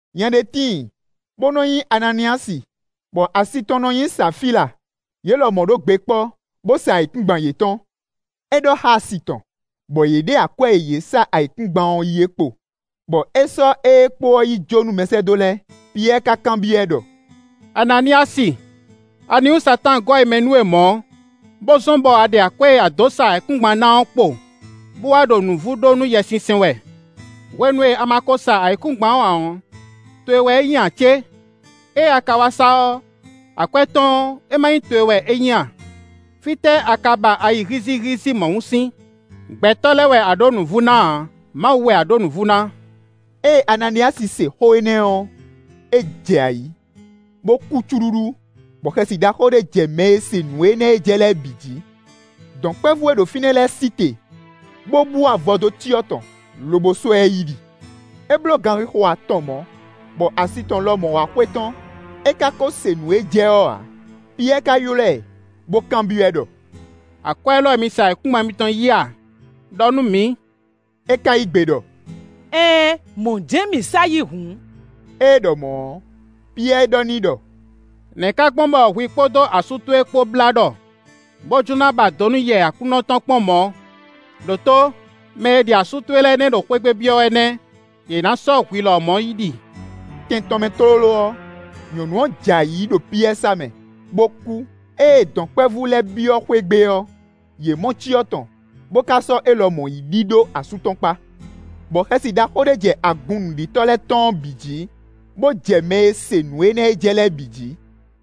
Nya ɖé tíin, bó nɔ́ nyí Ananíyasi, bɔ asi tɔn nɔ nyí Safíla. Yě lɔmɔ̌ ɖó gbe kpɔ́, bó sa ayǐkúngban yětɔn. É ɖɔ xá asi tɔn, bɔ yě ɖe akwɛ́ e yě sa ayǐkúngban ɔ́ yí ɔ́ kpo, bɔ é sɔ́ ée kpo ɔ́ yi jó nú mɛsɛ́dó lɛ́ɛ. Piyɛ́ɛ ka kanbyɔ́ ɛ ɖɔ: “Ananíyasi! Aniwú Satáan gɔ́ ayi mɛ nú we mɔ̌, bó zɔ́n bɔ a ɖe akwɛ́ e a dǒ sa ayǐkúngban ɔ́ ná ɔ́ kpo, bó wá ɖo nǔvú ɖó nú Yɛsinsɛn wɛ? Hwenu e a ma ko sa ayǐkúngban ɔ́ ǎ ɔ́, towe wɛ é nyí ǎ cé? Ée a ka wá sa ɔ́, akwɛ́ tɔn ɔ́, é má nyí towe wɛ é nyí a? Fítɛ́ a ka ba ayi hízíhízí mɔ̌hun sín? Gbɛtɔ́ lɛ́ɛ wɛ a ɖǒ nǔvú ná ǎ, Mawu wɛ a ɖǒ nǔvú ná.” Ée Ananíyasi se xó énɛ́ ɔ́, é jɛ ayǐ, bó kú cúɖúɖú, bɔ xɛsi ɖaxó ɖé jɛ mɛ e se nǔ énɛ́ e jɛ lɛ́ɛ bǐ jí. Dɔ̌nkpɛvú e ɖo fínɛ́ lɛ́ɛ sí te, bó bú avɔ dó cyɔ tɔn, lobo sɔ́ ɛ yi ɖi. É bló ganxixo atɔn mɔ̌, bɔ asi tɔn lɔmɔ̌ wá xwetɔ́n; é ka ko se nǔ e jɛ ɔ́ ǎ. Piyɛ́ɛ ka ylɔ́ ɛ, bó kanbyɔ́ ɛ ɖɔ: “Akwɛ́ élɔ́ wɛ mi sa ayǐkúngban mitɔn yí a? Đɔ nú mǐ.” É ka yí gbe ɖɔ: “Ɛɛn, mɔ̌ jɛ́n mǐ sa yí hǔn.” Ée é ɖɔ mɔ̌ ɔ́, Piyɛ́ɛ ɖɔ n'i ɖɔ: “Nɛ̌ ka gbɔn bɔ hwi kpódó asú towe kpó blá ɖɔ, bó jló ná ba do nú Yɛ Aklúnɔ tɔn kpɔ́n mɔ̌? Đǒtó; mɛ e ɖi asú towe lɛ́ɛ nɛ́ ɖo xwé gbe byɔ́ wɛ nɛ́; yě ná sɔ́ hwi lɔmɔ̌ yi ɖi.” Tɛn tɔn mɛ tlóló ɔ́, nyɔ̌nu ɔ́ jɛ ayǐ ɖo Piyɛ́ɛ sá mɛ, bó kú. Ée dɔ̌nkpɛvú lɛ́ɛ byɔ́ xwé gbe ɔ́, yě mɔ cyɔ tɔn, bó ka sɔ́ é lɔmɔ̌ yi ɖi ɖó asú tɔn kpá. Bɔ xɛsi ɖaxó ɖé jɛ agun nǔɖitɔ́ lɛ́ɛ tɔn ɔ́ bǐ jí, bó jɛ mɛ e se nǔ énɛ́ e jɛ lɛ́ɛ bǐ jí.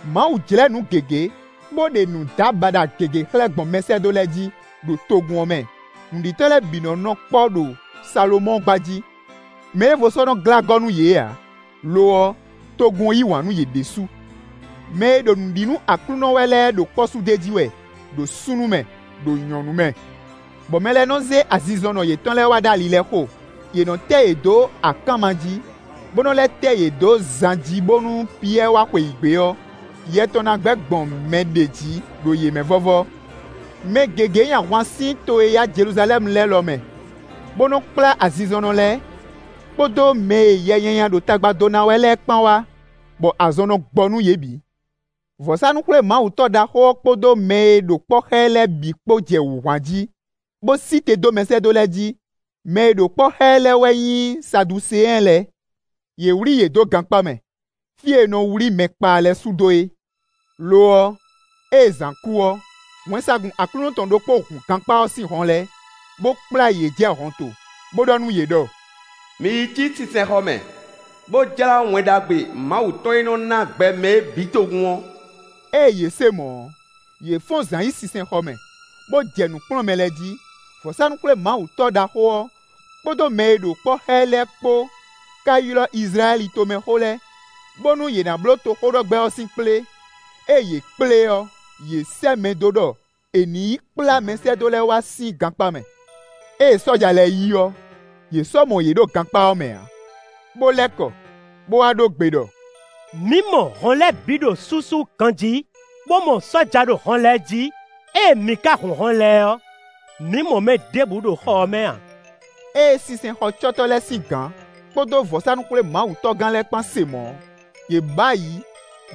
Mawu jlɛ́ nǔ gěgé, bó ɖe nǔdábaɖa gěgé xlɛ́ gbɔn mɛsɛ́dó lɛ́ɛ jí, ɖo togun ɔ́ mɛ. Nǔɖitɔ́ lɛ́ɛ bǐ nɔ́ nɔ kpɔ́ ɖo Salomɔ́ɔ gba jí. Mɛɖěvo sɔ́ nɔ́ glá gɔ́ nú yě ǎ; lo ɔ́, togun ɔ́ yí wǎn nú yě ɖésú. Mɛ e ɖo nǔ ɖi nú Aklúnɔ wɛ lɛ́ɛ ɖo kpɔ́ su d'é jí wɛ, ɖo súnnu mɛ, ɖo nyɔ̌nu mɛ. Bɔ mɛ lɛ́ɛ nɔ́ zé azinzɔnnɔ yětɔn lɛ́ɛ wá ɖó ali lɛ́ɛ xo; yě nɔ́ tɛ́ yě dó akánma jí, bó nɔ́ lɛ́ tɛ́ yě dó zan jí bónú Piyɛ́ɛ wá xweyǐgbe ɔ́, yɛ tɔn ná gbɛ́ gbɔn mɛ ɖěe jí ɖo yě mɛ vɔ́vɔ́. Mɛ gěgé nyi ahwan sín to e yá Jeluzalɛ́mu lɛ́ɛ lɔ mɛ, bó nɔ́ kplá azinzɔnnɔ lɛ́ɛ, kpódó mɛ e yɛ nyanya ɖo tagba dó ná wɛ lɛ́ɛ kpán wá, bɔ azɔn nɔ gbɔ nú yě bǐ. Vɔ̌sánú-xwlémawutɔ́ ɖaxó ɔ́ kpódó mɛ e ɖo kpɔ́ xá ɛ lɛ́ɛ bǐ kpó jɛ wǔ hwan jí, bó sí te dó mɛsɛ́dó lɛ́ɛ jí. Mɛ e ɖo kpɔ́ xá ɛ lɛ́ɛ wɛ nyí Saduseɛn lɛ́ɛ. Yě wlí yě dó gankpá mɛ, fí e è nɔ wlí mɛ kpaa lɛ́ɛ sú dó é. Lo ɔ́, ée zǎn kú ɔ́, wɛnsagun Aklúnɔ tɔn ɖokpó hun gankpá ɔ́ sín hɔn lɛ́ɛ, bó kplá yě jɛ hɔnto, bó ɖɔ nú yě ɖɔ: “Mi yi cí sinsɛnxɔ mɛ, bó jlá Wɛn Ɖagbe Mawu tɔn e nɔ ná gbɛ mɛ é bǐ togun ɔ́.” Ée yě se mɔ̌ ɔ́, yě fɔ́n zǎn yi sinsɛnxɔ mɛ, bó jɛ nǔ kplɔ́n mɛ lɛ́ɛ jí. Vɔ̌sánú-xwlémawutɔ́ ɖaxó ɔ́, kpódó mɛ e ɖo kpɔ́ xá ɛ lɛ́ɛ kpó ka ylɔ́ Izlayɛ́li tomɛxó lɛ́ɛ bónú yě ná bló toxóɖɔgbɛ́ ɔ́ sín kplé. Ée yě kplé ɔ́, yě sɛ́ mɛ dó ɖɔ è nǐ yi kplá mɛsɛ́dó lɛ́ɛ wá sín gankpá mɛ. Ée sɔ́ja lɛ́ɛ yi ɔ́, yě sɔ́ mɔ yě ɖo gankpá ɔ́ mɛ ǎ, bó lɛ́ kɔ bó wá ɖó gbe ɖɔ: “Mǐ mɔ hɔn lɛ́ɛ bǐ ɖo súsú ganjí, bó mɔ sɔ́ja ɖo hɔn lɛ́ɛ jí; ée mǐ ka hun hɔn lɛ́ɛ ɔ́, mǐ mɔ mɛ ɖěbǔ ɖo xɔ ɔ́ mɛ ǎ.” Ée sinsɛnxɔcɔ́tɔ́ lɛ́ɛ sín gǎn, kpódó vɔ̌sánú-xwlémawutɔ́gán lɛ́ɛ kpán se mɔ̌ ɔ́, yě bǔ ayǐ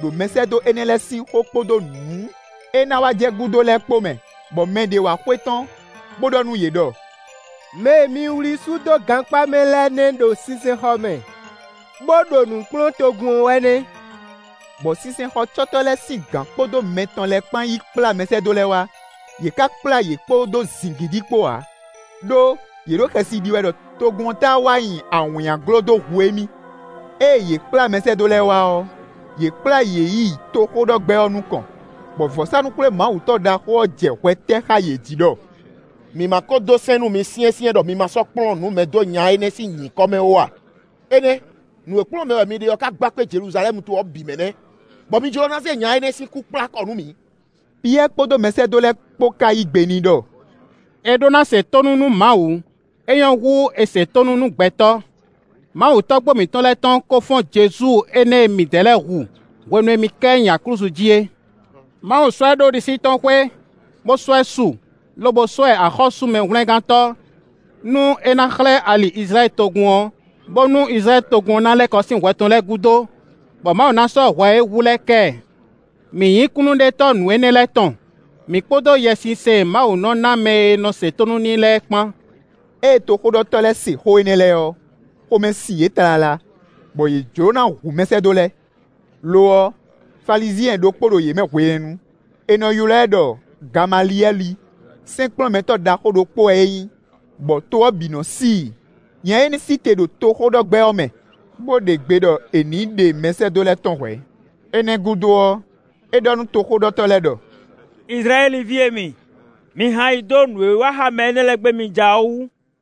ɖo mɛsɛ́dó énɛ́ lɛ́ɛ sín xó kpódó nǔ e ná wá jɛ gúdo lɛ́ɛ kpó mɛ. Bɔ mɛ ɖě wá xwetɔ́n, bó ɖɔ nú yě ɖɔ: “Mɛ e mi wlí sú dó gankpá mɛ lɛ́ɛ nɛ́ ɖo sinsɛnxɔ mɛ, bó ɖo nǔ kplɔ́n togun ɔ́ wɛ nɛ́.” Bɔ sinsɛnxɔcɔ́tɔ́ lɛ́ɛ sín gǎn kpódó mɛ tɔn lɛ́ɛ kpán yí kplá mɛsɛ́dó lɛ́ɛ wá; yě ka kplá yě kpódó zǐngídi kpó ǎ, ɖó yě ɖo xɛsi ɖi wɛ ɖɔ togun ɔ́ táá wá nyi awǐnnyaglo dó hu émí. Ée yě kplá mɛsɛ́dó lɛ́ɛ wá ɔ́, yě kplá yě yi toxóɖɔgbɛ́ ɔ́ nukɔn, bɔ vɔ̌sánú-xwlémawutɔ́ ɖaxó ɔ́ jɛ hwɛ tɛ́ xá yě jí ɖɔ: “Mǐ má kó dó sɛ́n nú mi syɛ́nsyɛ́n ɖɔ mi ma sɔ́ kplɔ́n nǔ mɛ dó nya énɛ́ sín nyǐkɔ mɛ ó a? Énɛ́ nǔ e kplɔ́n mɛ wɛ mi ɖe ɔ́ ka gba kpé Jeluzalɛ́mu to ɔ́ bǐ mɛ nɛ́; bɔ mi jló ná zé nya énɛ́ sín kú kplá kɔ nú mǐ.” Piyɛ́ɛ kpódó mɛsɛ́dó lɛ́ɛ kpó ká yí gbe n'i ɖɔ: “È ɖó ná se tónú nú Mawu; é nyɔ́ hú è se tónú nú gbɛtɔ́. Mawu tɔ́gbó mǐtɔn lɛ́ɛ tɔn kó fɔ́n Jezu énɛ́ e midɛɛ lɛ́ɛ hu, hwenu e mi ká ɛ nyi aklúzu jí é. Mawu sɔ́ ɛ ɖó ɖisí tɔn xwé, bó sɔ́ ɛ su, lobo sɔ́ ɛ axɔ́sú Mɛhwlɛ́ngántɔ́, nú é ná xlɛ́ ali Izlayɛ́li togun ɔ́, bónú Izlayɛ́li togun ɔ́ ná lɛ́ kɔ sín hwɛ tɔn lɛ́ɛ gúdo, bɔ Mawu ná sɔ́ hwɛ e é hu lɛ́ɛ kɛ ɛ. Mǐ nyí kúnnuɖetɔ́ nǔ énɛ́ lɛ́ɛ tɔn; mǐ kpódó Yɛsinsɛn e Mawu nɔ́ ná mɛ e nɔ se tónú n'i lɛ́ɛ é kpán.” Ée toxóɖɔtɔ́ lɛ́ɛ se xó énɛ́ lɛ́ɛ ɔ́, xomɛ sin yě tlala, bɔ yě jló ná hu mɛsɛ́dó lɛ́ɛ. Lo ɔ́, Falizyɛn ɖokpó ɖo yě mɛ hwenɛ́nu; è nɔ ylɔ́ ɛ ɖɔ Gamaliyɛ́li; sɛ́nkplɔ́nmɛtɔ́ ɖaxó ɖokpó wɛ é nyí, bɔ to ɔ́ bǐ nɔ́ sí i. Nya énɛ́ sí te ɖo toxóɖɔgbɛ́ ɔ́ mɛ, bó ɖe gbe ɖɔ è nǐ ɖe mɛsɛ́dó lɛ́ɛ tɔ́n hwɛ̌. Énɛ́ gúdo ɔ́, é ɖɔ nú toxóɖɔtɔ́ lɛ́ɛ ɖɔ: “Izlayɛ́li ví e mi, mi hɛn ayi dó nǔ e wa xá mɛ énɛ́ lɛ́ɛ gbé mi ja ɔ́ wú.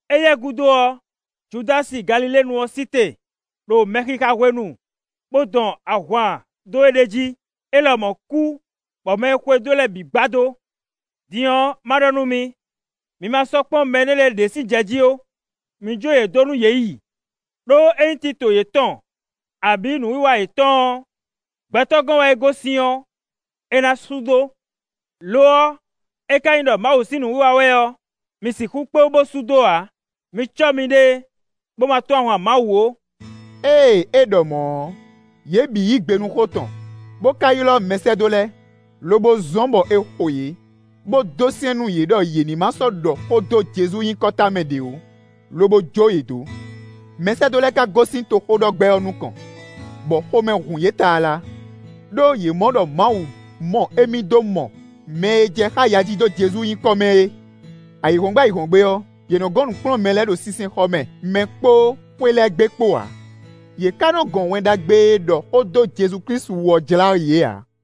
Éyɛ́ gúdo ɔ́, Judási Galiléenu ɔ́ sí te, ɖo mɛxixa hwenu, bó dɔn ahwan dó éɖée jí; é lɔmɔ̌ kú, bɔ mɛ e xwedó e lɛ́ɛ bǐ gbadó. Din ɔ́, ma ɖɔ nú mi, mi ma sɔ́ kpɔ́n mɛ énɛ́ lɛ́ɛ ɖě sín jɛ jí ó; mi jó yě dó nú yě yi. Đó ényí tito yětɔn abǐ nǔwiwa yětɔn ɔ́, gbɛtɔ́ gɔ́n wɛ é gosín ɔ́, é ná sú dó. Lo ɔ́, é ka nyí ɖɔ Mawu sín nǔwiwa wɛ ɔ́, mi sixú kpé wú bó sú dó ǎ; mi cɔ́ miɖée, bó má tɔ́n ahwan Mawu ó.” Ée é ɖɔ mɔ̌ ɔ́, yě bǐ yí gbe nú xó tɔn, bó ka ylɔ́ mɛsɛ́dó lɛ́ɛ, lobo zɔ́n bɔ è xo yě, bó dó sɛ́n nú yě ɖɔ yě má sɔ́ ɖɔ xó dó Jezu nyǐkɔ tamɛ ɖě ó, lobo jó yě dó. Mɛsɛ́dó lɛ́ɛ ka gosín toxóɖɔgbɛ́ ɔ́ nukɔn, bɔ xomɛ hun yě tlala, ɖó yě mɔ ɖɔ Mawu mɔ émí dó mɔ mɛ e jɛ xá ya ji dó Jezu nyǐkɔ mɛ é. Ayǐhɔ́ngbe ayǐhɔ́ngbe ɔ́, yě nɔ́ gɔn nǔ kplɔ́n mɛ lɛ́ɛ ɖo sinsɛnxɔ mɛ mɛ kpó xwé lɛ́ɛ gbe kpó ǎ, yě ka nɔ́ gɔn Wɛn Ɖagbe e ɖɔ xó dó Jezu-Klísu wú ɔ́ jlá yě ǎ.